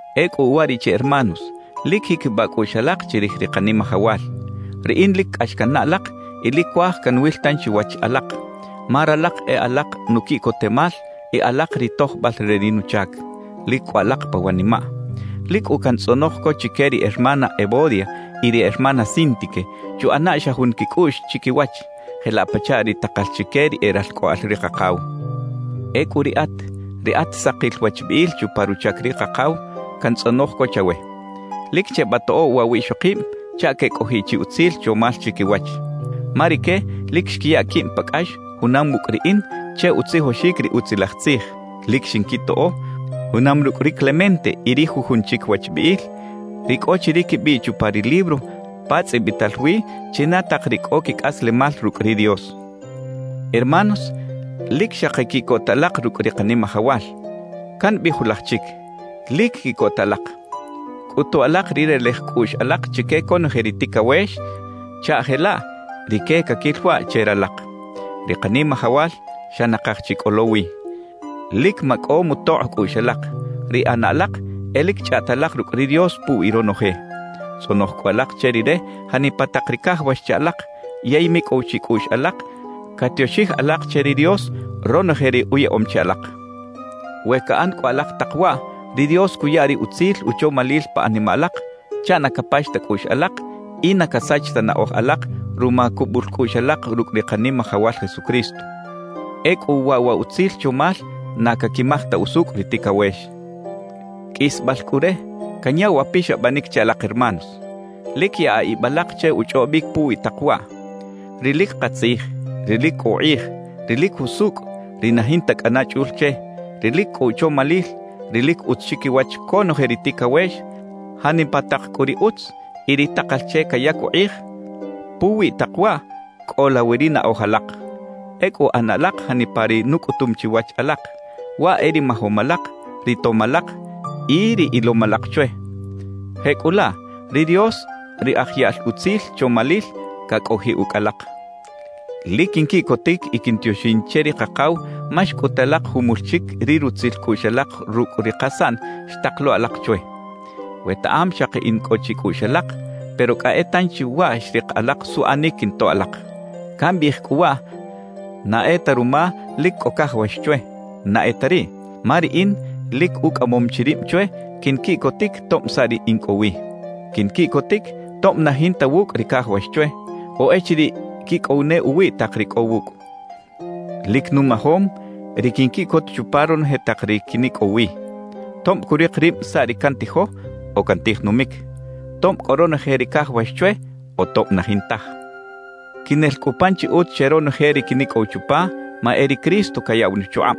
Ecꞌu uwariꞌche hermanos, lic jiquibaꞌ cꞌuꞌx alak chirij ri Kanimajawal. Riꞌin lic cꞌax cannaꞌ alak y lic cuaj canwil tanchi wach alak, ma ralak e alak nuquiꞌcotemal y alak ri tojbal re ri nuchac. Lic cꞌo alak pa wanimaꞌ. Lic cꞌu cantzꞌonoj co chique ri hermana Evodia y ri hermana Síntique chuꞌana xa jun quicꞌuꞌx chiquiwach, jelaꞌ pachaꞌ ri takal chique ri e ralcꞌoꞌal ri Kakaw. Ecꞌu riꞌat, ri at sakil wachbiꞌil chupa ruchac ri Kakaw, cantzꞌonoj co chawe: Lic chebatoꞌo waꞌ wiꞌxokib chaꞌ quecꞌojiꞌ chi utzil chomal chiquiwach. Ma rique lic xquiya quib pa cꞌax junam wucꞌ riꞌin che utzijoxic ri Utzilaj Tzij; lic xinquitoꞌo, junam rucꞌ ri Clemente y ri jujun chic wachbiꞌil, ri cꞌo chi ri quibiꞌ chupa ri libro pa tzꞌibital wi china tak ri cꞌo quicꞌaslemal rucꞌ ri Dios. Hermanos, lic xaki quiꞌcota alak rucꞌ ri Kanimajawal. Cambiꞌij julaj chic: ¡Lic quiꞌcota alak! Cꞌutu alak ri relej cꞌuꞌx alak chique conoje ri ticawex chaꞌ jelaꞌ rique caquil waꞌ che ralak. Ri Kanimajawal xa nakaj chi cꞌo lo wi. Lic macꞌo mutokꞌ cꞌuꞌx alak; ri ꞌana alak e lic chꞌaꞌta alak rucꞌ ri Dios puwi ronoje. Tzꞌonoj cꞌu alak che Rire janipa tak ri cajawax che alak yey micꞌow chicꞌuꞌx alak catioxij alak che ri Dios ronoje ri uyaꞌom che alak. We caꞌan cꞌu alak tak waꞌ, ri Dios cuya ri utzil uchomalil pa animaꞌ alak chaꞌ na capax ta cꞌuꞌx alak y na casach ta naꞌoj alak ruma cubul cꞌuꞌx alak rucꞌ ri Kanimajawal Jesucristo. Ecꞌu waꞌ wa utzil chomal na caquimaj ta usucꞌ ri ticawex. Qꞌuisbal cꞌu re, canya wa pixabanic che alak hermanos: Lic yaꞌa ib alak che uchꞌobic puwi tak waꞌ: ri lic katzij, ri lic cꞌo ukꞌij, ri lic jusucꞌ, ri na jinta cꞌana chꞌul che, ri lic cꞌo uchomalil, ri lic utz chiquiwach conoje ri ticawex; janipa tak cꞌu ri utz y ri takal che cayac ukꞌij, puwi tak waꞌ cꞌola wi ri naꞌoj alak. Ecꞌu ꞌana alak janipa ri nucꞌutum chiwach alak, waꞌ e ri majom alak, ri tom alak y ri ilom alak chwe. Jecꞌulaꞌ, ri Dios, ri aj yaꞌl utzil chomalil, cacꞌojiꞌ ucꞌ alak. Lic quinquiꞌcotic y quintioxin che ri Kakaw ma xcꞌut alak jumul chic ri rutzil cꞌuꞌx alak rucꞌ ri kasaꞌn xtak lo alak chwe. Wetaꞌam xaki in cꞌo chicꞌuꞌx alak, pero cꞌa e tanchi waꞌ xrik alak suꞌanic quintoꞌ alak. Cambiꞌij cꞌu waꞌ na e ta ruma lic cꞌo cajawax chwe, na e ta riꞌ. Ma riꞌin lic ucꞌamom chi rib chwe quinquiꞌcotic tob saꞌ ri in cꞌo wi. Quinquiꞌcotic tob na jinta wucꞌ ri cajawax chwe o echiriꞌ quicꞌow ne uwiꞌ tak ri cꞌo wucꞌ. Lic numajom ri quinquiꞌcot chupa ronoje tak ri quinicꞌow wi, tob curik rib saꞌ ri cantijo o cantij numic, tob cꞌo ronoje ri cajawax chwe o tob na jintaj. Quinel cꞌu pan chi utz che ronoje ri quinicꞌow chupa, ma e ri Cristo cayaꞌw nuchukꞌab.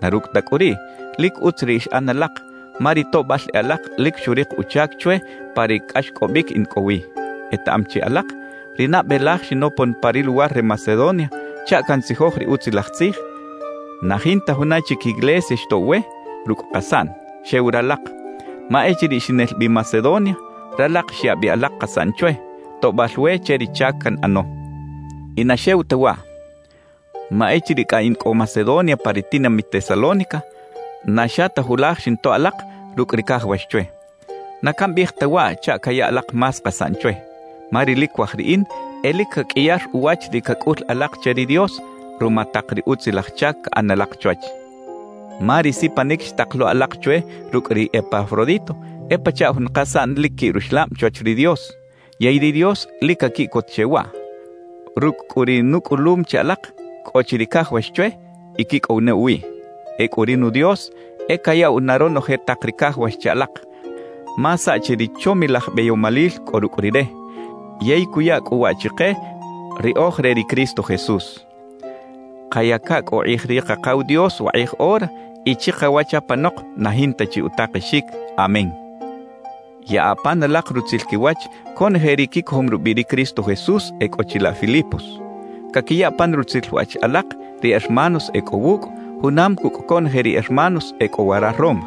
Na rucꞌ ta cꞌu riꞌ, lic utz ri xꞌan alak, ma ri toꞌbal e alak lic xurik uchac chwe pa ri cꞌaxcꞌobic in cꞌo wi. Etaꞌam chi alak, ri nabe laj xinopon pa ri luwar re Macedonia chaꞌ cantzijoj ri Utzilaj Tzij, na jinta juna chic iglesia xtoꞌw we rucꞌ kasaꞌn, xew ralak. Ma echiriꞌ xinel bi Macedonia, ralak xya bi alak kasaꞌn chwe, toꞌbal we che ri chac canꞌano. Y na xew ta waꞌ. Ma echiriꞌ cꞌa in cꞌo Macedonia pa ri tinamit Tesalónica, na xa ta julaj xintoꞌ alak rucꞌ ri cajawax chwe. Na cambiꞌij ta waꞌ chaꞌ caya alak más kasaꞌn chwe, ma ri lic cuaj riꞌin e lic caqꞌuiyar uwach ri cacꞌul alak che ri Dios ruma tak ri utzilaj chac caꞌan alak chwach. Ma ri sipanic xtak lo alak chwe rucꞌ ri Epafrodito e pachaꞌ jun kasaꞌn lic quiꞌ ruxlab chwach ri Dios, yey ri Dios lic caquiꞌcot che waꞌ. Rucꞌ cꞌu ri nucꞌulum che alak, cꞌo chi ri cajawax chwe y quicꞌow ne uwiꞌ. Ecꞌu ri nu Dios e cayaꞌw na ronoje tak ri cajawax che alak, ma saꞌchi ri chomilaj beyomalil cꞌo rucꞌ Rire; yey cuya cꞌu waꞌ chike ri oj re ri Cristo Jesús. Kayaca cꞌu ukꞌij ri Kakaw Dios wakꞌij ora y chikawach apanok na jinta chi utakexic. Amén. Yaꞌa pan alak rutzil quiwach conoje ri quicojom rubiꞌ ri Cristo Jesús e cꞌo chilaꞌ Filipos. Caquiya pan rutzil wach alak ri hermanos e cꞌo wucꞌ junam cucꞌ conoje ri hermanos e cꞌo wara Roma.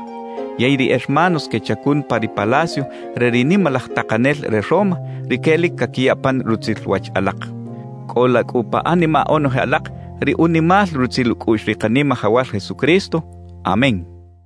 Yey ri hermanos quechacun pa ri palacio re ri nimalaj takanel re Roma, rique lic caquiya pan rutzil wach alak. Cꞌola cꞌu pa animaꞌ onoje alak ri unimal rutzil ucꞌuꞌx ri Kanimajawal Jesucristo. Amén.